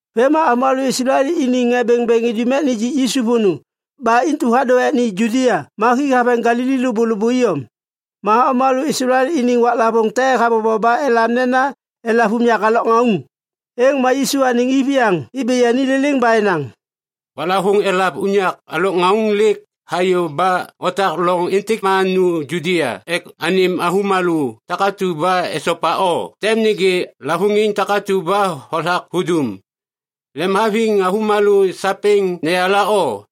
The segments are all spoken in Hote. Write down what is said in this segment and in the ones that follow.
Vêm ma Islael iniŋ ŋê bêŋbêŋ idum ek nijik Yisu vônô. Ba intu hadô ek ni Judia ma hi haveŋ Galili lôbôlôbô iyom. Ma avômalô Islael iniŋ waklavôŋ te habobo ba elam nena Elav Unyak Alôkŋauŋ. Êŋ ma Yisu anêŋ iviyaŋ ibi yani liliŋ ba enaŋ, “Waklavôŋ Elav Unyak Alôkŋauŋ lêk hayô ba otak loŋ êntêk ma nu Judia ek anêm avômalô takatu ba esopa o tem nêgê lavôŋiŋ takatu ba hothak hudum. Lemhaviŋ avômalô sapêŋ neyala o,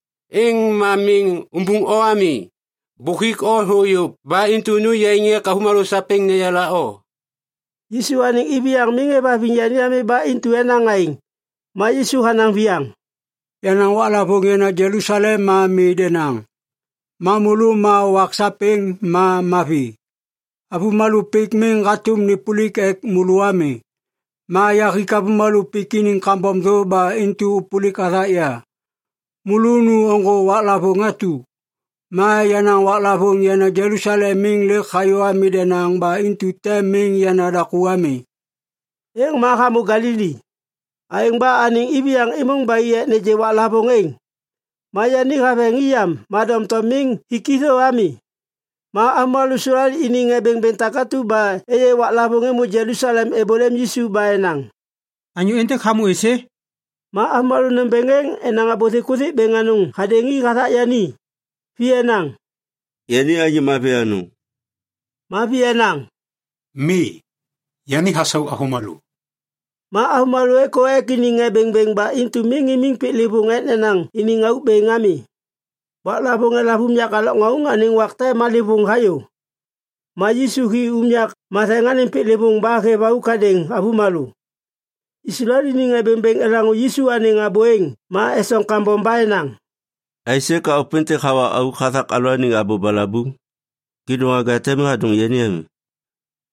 êŋ ma miŋ umbuŋ o ami. Bôk huik o thô yôv ba intu nu yaiŋ ek avômalô sapêŋ neyala o!” Yisu anêŋ iviyaŋ miŋ êvhaviŋ yani ami ba intu enaŋ aêŋ. Ma Yisu hanaŋ viyaŋ, “Yenaŋ waklavôŋ yana Jelusalem ma mi denaŋ. Ma môlô ma wak sapêŋ ma mavi. Avômalô pik miŋ hatôm nêpôlik ek môlô ami. Ma yahik avômalô pik iniŋ kambom thô ba intu êpôlik hathak ya. Môlô nu ôŋgô waklavôŋ atu. Ma yenaŋ waklavôŋ yana Jelusalem miŋ lêk hayô ami denaŋ ba intu tem miŋ yana daku ami.” Êŋ ma hamô Galili. Aêŋ ba anêŋ iviyaŋ êmôŋ ba i ek nêgê waklavôŋ êŋ. Ma yani haveŋ i yam ma doŋtom miŋ hik i thô ami. Ma Islael iniŋ ŋê bêŋbêŋ takatu ba êyê waklavôŋ êmô Jelusalem êbôlêm Yisu ba enaŋ, “Anyô êntêk hamô êsê?” Ma avômalô nômbêŋ êŋ enaŋ abô thikuthik bêŋ anôŋ hadêŋ i hathak yani. Vi enaŋ, “Yani anyô mavi anôŋ.” Ma vi enaŋ, “Mi. Yani hasau avômalô.” Ma avômalô êkô ek iniŋ ŋê bêŋbêŋ ba intu miŋ imiŋ piklêvôŋ ek nenaŋ iniŋ auk bêŋ ami. Waklavôŋ Elav Unyak Alôkŋauŋ anêŋ wak te malêvôŋ hayô. Ma Yisu hi unyak matheŋ anêŋ piklêvôŋ ba hêv auk hadêŋ avômalô. Islael iniŋ ŋê bêŋbêŋ elaŋô Yisu anêŋ abô êŋ ma esoŋ kambom ba enaŋ, “Aisê ka ôpêntêk hawa auk hathak alalôaniŋ abô balabuŋ? Kêdôŋwaga te miŋ hadôŋ yani ami.”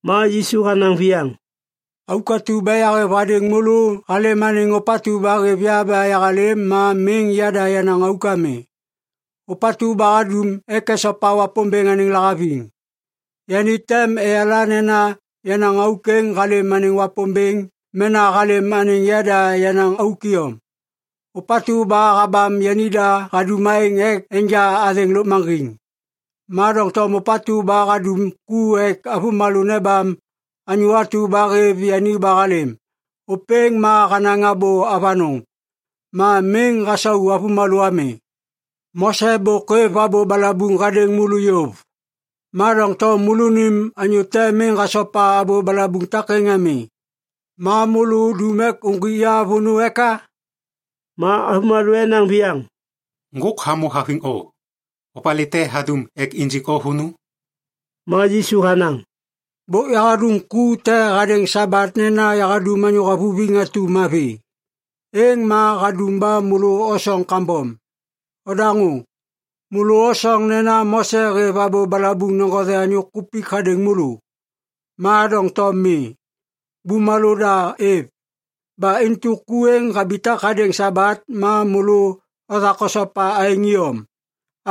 Ma Yisu hanaŋ viyaŋ, “Auk atu ba yahêv hadêŋ môlô halêm anêŋ ôpatu ba hêv ya ba yahalêm ma miŋ yada yenaŋ auk ami. Ôpatu ba hadum ek esopa Wapômbêŋ anêŋ lahaviŋ, yani tem eyala nena yenaŋ auk êŋ halêm anêŋ Wapômbêŋ mena halêm anêŋ yada yenaŋ auk iyom. Ôpatu ba habam yanida hadum aêŋ ek enja athêŋ lôkmaŋgiŋ. Ma doŋtom ôpatu ba hadum ku ek avômalô nebam anyô atu ba hêv yani ba halêm, ôpêŋ ma hanaŋ abô avanôŋ. Ma miŋ hasau avômalô ami. Mose bôk hêv abô balabuŋ hadêŋ môlô yôv. Ma doŋtom môlônim anyô te miŋ hasopa abô balabuŋ takêŋ ami! Ma môlô udum ek uŋgwik ya vônô eka?” Ma avômalô enaŋ viyaŋ, “Ŋgôk hamô haviŋ o. Opalê te hadum ek injik o vônô?” Ma Yisu hanaŋ, “Bôk yahadum ku te hadêŋ Sabat nena yahadum anyô havuviŋ atu mavi. Êŋ ma hadum ba môlô osoŋ kambom! Odaŋô! Môlô osoŋ nena Mose hêv abô balabuŋ neŋgothe anyô kupik hadêŋ môlô. Ma doŋtom mi. Bumalô da êv. Ba intu ku êŋ habitak hadêŋ Sabat ma môlô othak osopa aêŋ iyom.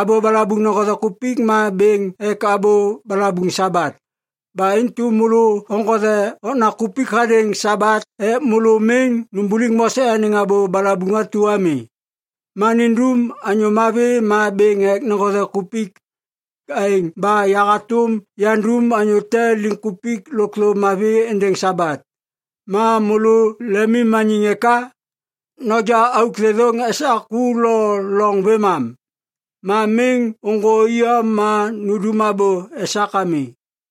Abô balabuŋ neŋgothe kupik ma bêŋ ek abô balabuŋ Sabat. Ba intu môlô oŋgothe okna kupik hadêŋ Sabat ek môlô miŋ numbuliŋ Mose anêŋ abô balabuŋ atu ami. Ma nindum anyô mavi ma bêŋ ek neŋgothe kupik! Aêŋ ba yahatôm yandum anyô te liŋkupik lôkthô mavi êndêŋ Sabat. Ma môlô lemimmaniŋ eka? Noja auk thêthôŋ esak ku lo loŋ vêmam. Ma miŋ ôŋgô iyom ma nundum abô esak ami.”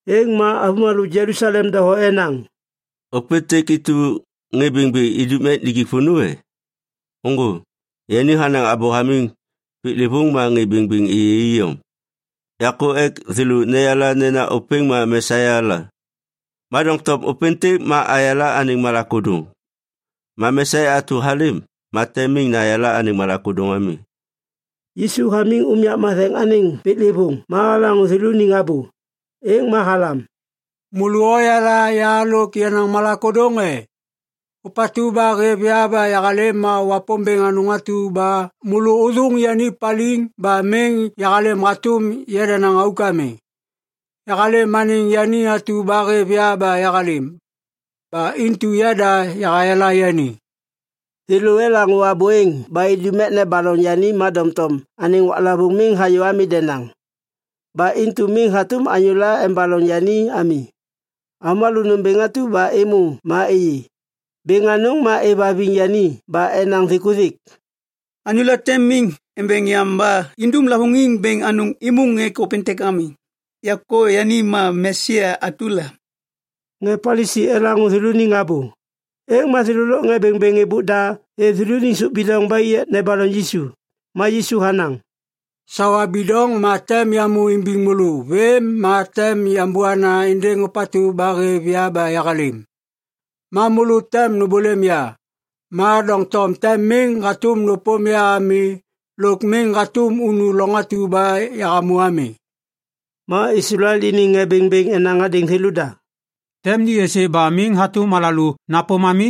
Êŋ ma avômalô Jelusalem doho enaŋ, “Ôpêntêk intu ba ŋê bêŋbêŋ idum ek nijik vônô, e? Ôŋgô, yani hanaŋ abô hamiŋ piklêvôŋ ma ŋê bêŋbêŋ êyê iyom. Yakô ek thêlô neyala nena ôpêŋ ma Mesia la. Ma doŋtom ôpêntêk ma ayala anêŋ malak ôdôŋ. Ma Mesia atu halêm ma tem miŋ nayala anêŋ malak ôdôŋ ami.” Yisu hamiŋ unyak matheŋ anêŋ piklêvôŋ ma halaŋô thêlôniŋ abô. Êŋ ma halam, “Môlô oyala ya lôk yenaŋ malak ôdôŋ e? Ôpatu ba hêv ya ba yahalêm ma Wapômbêŋ anôŋ atu ba môlô ôthôŋ yani paliŋ ba miŋ yahalêm hatôm yadanaŋ auk ami. Yahalêm anêŋ yani atu ba hêv ya ba yahalêm. Ba intu yada yahayala yani.” Thêlô elaŋô abô êŋ ba idum ek nebaloŋ yani ma doŋtom anêŋ waklavôŋ miŋ hayô ami denaŋ. Ba intu miŋ hatôm anyôla embaloŋ yani ami. Avômalô nômbêŋ atu ba êmô ma êyê. Bêŋ anôŋ ma êvhaviŋ yani ba enaŋ thikuthik, “Anyôla tem miŋ embeŋ yam ba indum lavôŋiŋ bêŋ anôŋ êmôŋ ek ôpêntêk ami. Yakô yani ma Mesia atu la.” Ŋê Palisi elaŋô thêlôniŋ abô. Êŋ ma thêlô lôk ŋê bêŋbêŋ êbôk da êv thêlôniŋ sôp bidoŋ ba i ek nebaloŋ Yisu. Ma Yisu hanaŋ, “Sawa bidoŋ ma tem yamô imbiŋ môlô vêm ma tem yambôna êndêŋ ôpatu ba hêv ya ba yahalêm. Ma môlô tem nômbôlêm ya, ma doŋtom tem miŋ hatôm nôpôm ya ami lôk miŋ hatôm unu loŋ atu ba yahamô ami.” Ma Islael iniŋ ŋê bêŋbêŋ enaŋ hadêŋ thêlôda, “Tem ni êsê ba miŋ hatôm alalô napôm ami?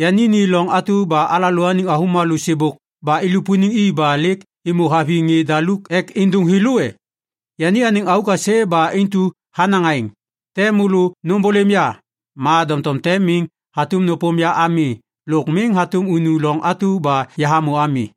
Yani ni loŋ atu ba alalôaniŋ avômalô sêbôk ba ilupuniŋ i ba lêk êmô haviŋ ŋê daluk ek êndôŋ thêlô e? Yani anêŋ auk aisê ba intu hanaŋ aêŋ, ‘Tem môlô nômbôlêm ya, ma doŋtom tem miŋ hatôm nôpôm ya ami lôk miŋ hatôm unu loŋ atu ba yahamô ami.’”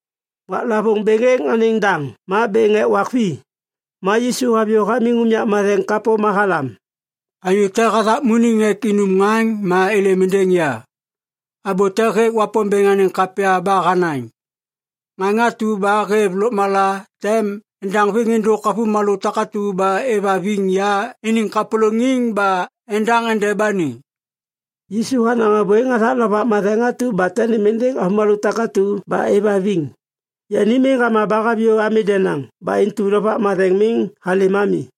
Waklavôŋ bêŋ êŋ anêŋ daŋ ma bêŋ ek wak vi. Ma Yisu haviyô hamiŋ unyak matheŋ kapô ma halam, “Anyô te hathakmuniŋ ek inum ŋaŋ ma êlêm êndêŋ ya. Abô te hêk Wapômbêŋ anêŋ kapya ba hanaŋ, ‘Ŋaŋ atu ba hêv lôkmala tem endaŋviŋ êndôk avômalô takatu ba êvhaviŋ ya iniŋ kapôlôŋiŋ ba endaŋ endeba ni.’” Yisu hanaŋ abô êŋ hathak Lovak Matheŋ atu ba tem nêm êndêŋ avômalô takatu ba êvhaviŋ. Yani miŋ hama ba haviyô ami denaŋ ba intu Lovak Matheŋ miŋ halêm ami.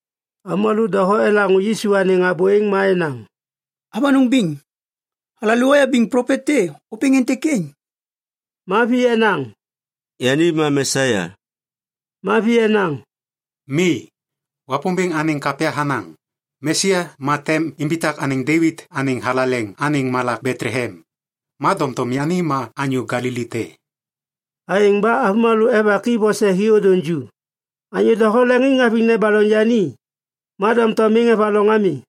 Avômalô doho elaŋô Yisu anêŋ abô êŋ ma enaŋ, “Avanôŋ biŋ! Alalô ayabiŋ plopet te! Ôpêŋ êntêk êŋ!” Ma vi enaŋ, “Yani ma Mesia!” Ma vi enaŋ, “Mi. Wapômbêŋ anêŋ kapya hanaŋ, ‘Mesia ma tem imbitak anêŋ Devit anêŋ thalaleŋ anêŋ malak Betlehem.’ Ma doŋtom yani ma anyô Galili te.” Aêŋ ba avômalô evak i vose hi ôdôŋ ju. Anyô doho leŋiŋ haviŋ nebaloŋ yani, ma doŋtom miŋ evaloŋ ami.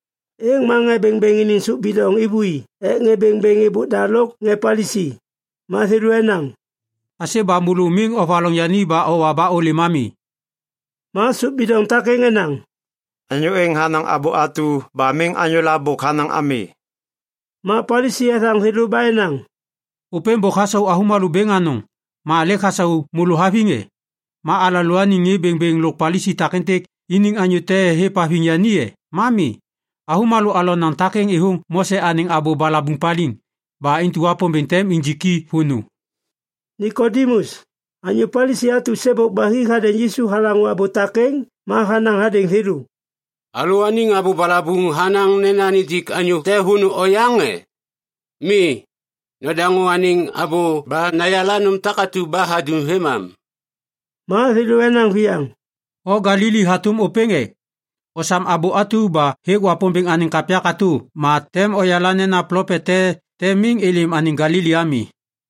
Êŋ ma ŋê bêŋbêŋ iniŋ sôp bidoŋ êvôi ek ŋê bêŋbêŋ êbôk da lôk ŋê Palisi. Ma thêlô enaŋ, “Aisê ba môlô miŋ ovaloŋ yani ba owa ba ôlêm ami?” Ma sôp bidoŋ takêŋ enaŋ, “Anyô êŋ hanaŋ abô atu ba miŋ anyô la bôk hanaŋ ami.” Ma Palisi ethaŋ thêlô ba enaŋ, “Ôpêŋ bôk hasau avômalô bêŋ anôŋ. Ma lêk hasau môlô haviŋ e? Ma alalôaniŋ ŋê bêŋbêŋ lôk Palisi takêntêk iniŋ anyô te hêvhaviŋ yani e? Ma mi! Avômalô alonaŋ takêŋ êthôŋ Mose anêŋ abô balabuŋ paliŋ. Ba intu Wapômbêŋ tem injiki vônô!” Nikodimus, anyô Palisi atu sêbôk ba hi hadêŋ Yisu halaŋô abô takêŋ ma hanaŋ hadêŋ thêlô, “Alalôaniŋ abô balabuŋ hanaŋ nena nijik anyô te vônô oyaŋ e? Mi. Nadaŋô anêŋ abô ba nayala nôm takatu ba hadum vêmam.” Ma thêlô enaŋ viyaŋ, “O Galili hatôm ôpêŋ e? Osam abô atu ba hêk Wapômbêŋ anêŋ kapya katô ma tem oyala nena plopet te tem miŋ êlêm anêŋ Galili ami.”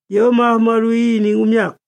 Yôv ma avômalô i iniŋ unyak.